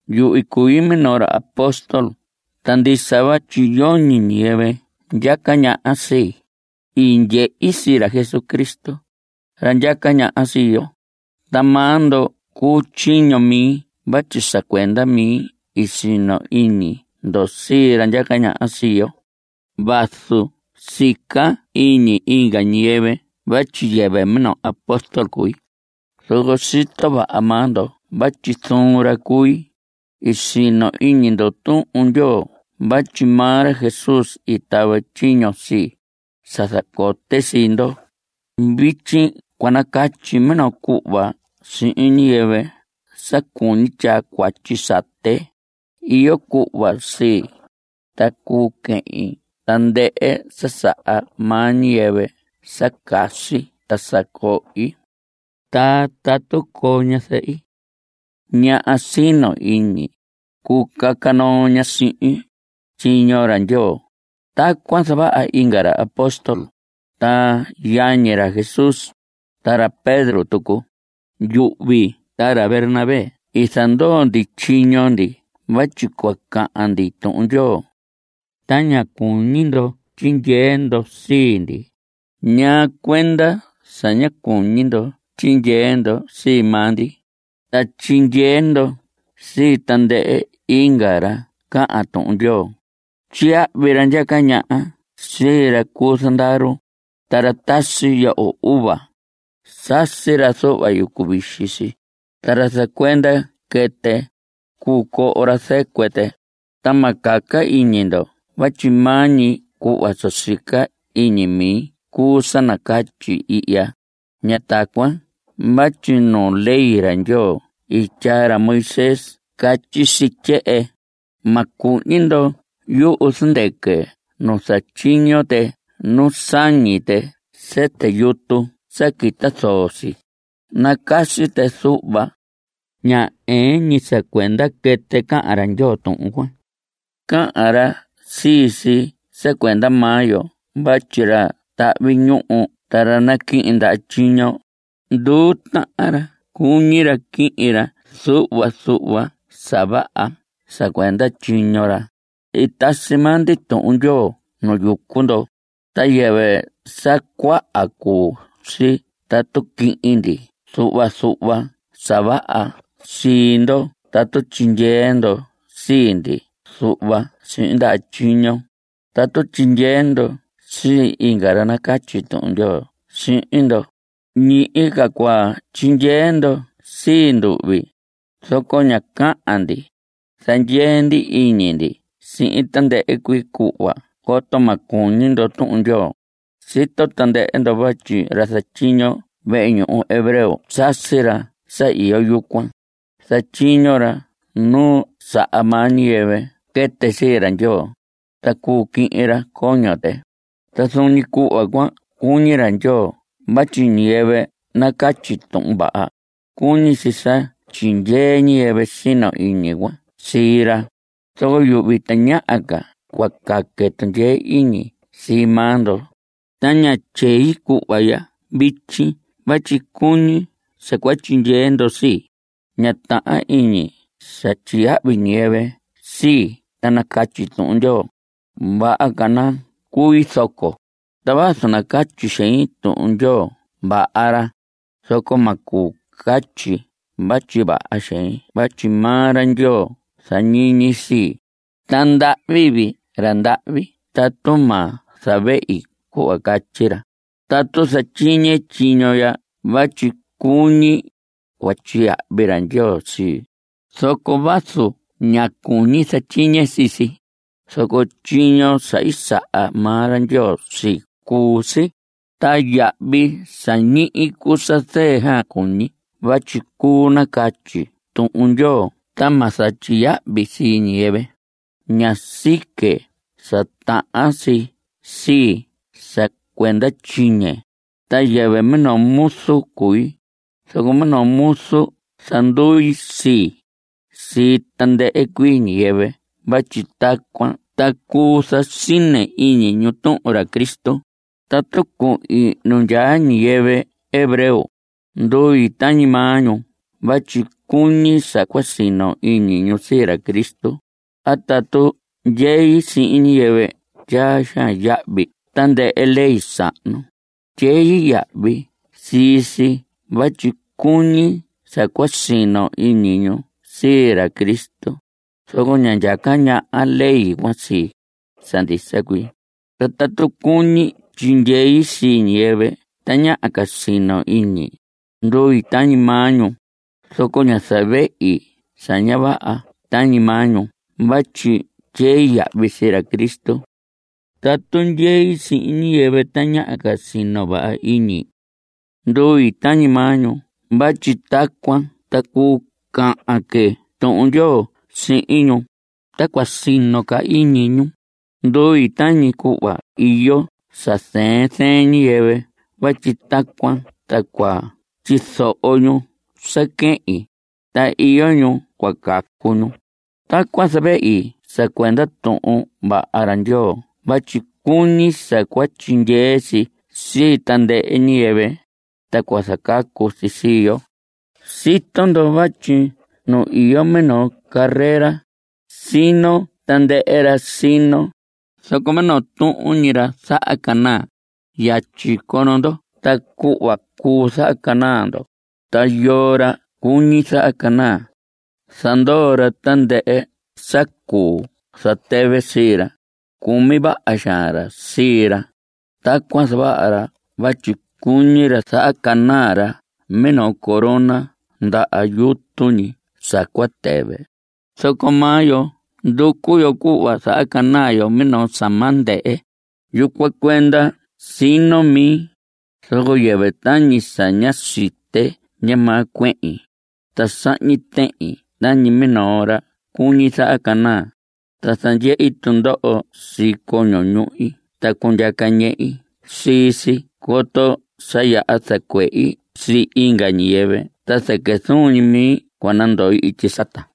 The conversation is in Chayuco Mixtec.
Yuhvi cui minoo ra apóstol. Ta ndisa vatyi yoñi ñiyɨvɨ ndyaca ñaha sii. I ndyehi sii ra Jesucristo, ra ndyaca ñaha sii yo. Ta maa ndo cuu tyiño mi vatyi sa cuenda mi i sino iñi ndo sii ra ndyaca ñaha sii yo. Vazu sica iñi inga ñiyɨvɨ vatyi yɨvɨ minoo apóstol cui, zoco sito vaha maa ndo vatyi zuun ra cui. I sino iñi ndo Tuhun Ndyoo vatyi maa ra Jesús i tava tyiño sii, sa zacote sii ndo. Vityi cua nacatyi minoo cuhva sihin ñiyɨvɨ sa cuñi tyaa cuatyi sate. Iyo cuhva sii, ta cuu quihin tandɨhɨ sa saha maa ñiyɨvɨ sa casi ta sa cohi. Ta tatu coo ñazɨhi, ñaha sino iñi, cuu caca noo ña sihin, tyiño ra Ndyoo. Tacuan zavaha inga ra apóstol, ta yañi ra Jesús, ta ra Pedro tucu. Yuhvi ta ra Bernabé i zandoo ndi tyiño ndi vatyi cua cahan ndi Tuhun Ndyoo. Ta ña cuñi ndo tyindyee ndo sii ndi. ¿Ñaa cuenda sa ña cuñi ndo tyindyee ndo sii maa ndi, ta tyindyee ndo sii tandɨhɨ inga ra cahan Tuhun Ndyoo? Tyiyahvi ra ndyaca ñaha sii ra cu zandaru. Ta ra tasi yoho uva, sasi ra yucu vixi si. Ta ra zacuenda quɨtɨ, cuu coho ra zɨcuɨ tɨ. Ta ma caca iñi ndo vatyi maa ñi cuhva sa sica ñi iñi mi cuu sa nacatyi ihya. Ña tacuan vatyi nu ley ra Ndyoo i tyaa ra Moisés catyi si tyehen: “Ma cuhñi ndo yuhu zɨndɨquɨ nu zatyiño tɨ nu sañi tɨ sɨtɨ yutu ta quita zoo si. Nacasi tɨ zuhva.” Ña ɨɨn ñi sa cuenda quɨtɨ cahan ra Ndyoo tuhun cuan. Cahan ra sii si sa cuenda maa yo vatyi ra tahvi ñuhu ta ra naquihin ndaha tyiño, nduu tahan ra cuñi ra quihin ra zuhva zuhva sa vaha sa cuenda tyiño ra. I tasi maa ndi Tuhun Ndyoo nu yucu ndo. Ta yɨvɨ sa cuaha cuu si tatu quihin ndi zuhva zuhva sa vaha sii ndo (tatu tyindyee ndo sii ndi zuhva sihin ndaha tyiño). Tatu tyindyee ndo sii inga ra nacatyi Tuhun Ndyoo sihin ndo, ñihi ca cua tyindyee ndo sii nduhvi. Zoco ña cahan ndi. Zandyee ndi iñi ndi sihin tandɨhɨ cuii cuhva coto ma cuñi ndo Tuhun Ndyoo. Sito tandɨhɨ ndo vatyi ra zatyiño vehe ñuhu hebreo sasi ra sa iyo yucuan. Zatyiño ra nu saha maa ñiyɨvɨ quɨtɨ sii ra Ndyoo, ta cuu quihin ra coño tɨ. Ta zuun ñi cuhva cuan cuñi ra Ndyoo vatyi ñiyɨvɨ nacatyi Tuhun Vaha ra, cuñi si sa tyindyee ñiyɨvɨ sino iñi cuan sii ra. Zoco yuhvi tañaha ca cua caque tundyee iñi sii maa ndo. Ta ña tyei cuhva ya vityi vatyi cuñi sa cua tyindyee ndo sii. Ña tahan iñi sa tyiyahvi ñiyɨvɨ sii ta nacatyi Tuhun Ndyoo. Vaha ca nacui zoco. Ta vazu nacatyi xein Tuhun Vaha ra, zoco ma cuu catyi vatyi vaha xein vatyi maa ra Ndyoo zañiñi sii. Ta ndahvi vii ra ndahvi tatu ma zavehi cuhva catyi ra. Tatu zatyiñe tyiño ya vatyi cuñi, cua tyiyahvi ra Ndyoo sii. Zoco vazu ña cuñi zatyiñe sii si, zoco tyiño sa i saha maa ra Ndyoo sii cuu si. Ta yahvi sa ñihi cuu sa zɨɨ xaan cuñi vatyi cuu nacatyi Tuhun Ndyoo ta ma zatyiyahvi sii ñiyɨvɨ. Ña sique sa tahan si sii sa cuenda tyiñe. Ta yɨvɨ minoo muzu cui, zoco minoo muzu zandui sii, sii tandɨhɨ cuii ñiyɨvɨ vatyi tacuan ta cuu zasine iñi ñu tuhun ra Cristo. Tatu cuhin nu ndyaa ñiyɨvɨ hebreo, ndui tañi maa ñu vatyi cuñi sa cua sino iñi ñu sii ra Cristo. A tatu ndyei sihin ñiyɨvɨ tyaa xaan yahvi tandɨhɨ ley sahnu, tyei yahvi sii si vatyi cuñi sa cua sino iñi ñu sii ra Cristo. Zoco ña ndyaca ñaha ley cuan sii, sa ndisa cuii. Ta tatu cuñi tyindyei sii ñiyɨvɨ tañaha ca sino iñi, ndui tañi maa ñu, zoco ña zavehi sa ña vaha tañi maa ñu vatyi tyei yahvi sii ra Cristo. Tatu ndyei sihin ñiyɨvɨ tañaha ca sino vaha iñi, ndui tañi maa ñu vatyi tacuan ta cuu cahan que Tuhun Ndyoo sihin ñu, ta cua sino ca iñi ñu. Ndui tañi cuhva iyo sa zɨɨn zɨɨn ñiyɨvɨ vatyi tacuan ta cua tyizoho ñu sa quehin, ta iyo ñu cua cacu ñu. Tacuan zavehi sa cuenda Tuhun Vaha ra Ndyoo vatyi cuñi sa cua tyindyee si sii tandɨhɨ ñiyɨvɨ, ta cua zacacu si sii yo. Sito ndo vatyi nu iyo minoo carrera, sino tandɨhɨ ra sino, zoco minoo tuhun ñi ra zahacanaa. Yatyi cono ndo tacuhva cuu zahacanaa ndo. Ta yoo ra cuñi zahacanaa, zandoo ra tandɨhɨ sa cuu zatɨvɨ sii ra. Cumi vaha xaan ra sii ra. Tacuan zavaha ra vatyi cuñi ra zahacanaa ra minoo corona ndaha yutu ñi sa cua tɨvɨ. Zoco maa yo nducu yo cuhva zahacanaa yo minoo sa ma ndɨhɨ. Yucuan cuenda sino mi, zoco yɨvɨ tañi sa ña site ndyamaa cuehin. Ta sahñi tehin tañi minoo ra cuñi zahacanaa. Ta zandyehi tundoho sii coño ñuhi ta cundyaca ñehi sii si coto sa yaha zacuehi sii inga ñiyɨvɨ ta zɨquɨ zuun ñi mi cua nandoi ityi sata.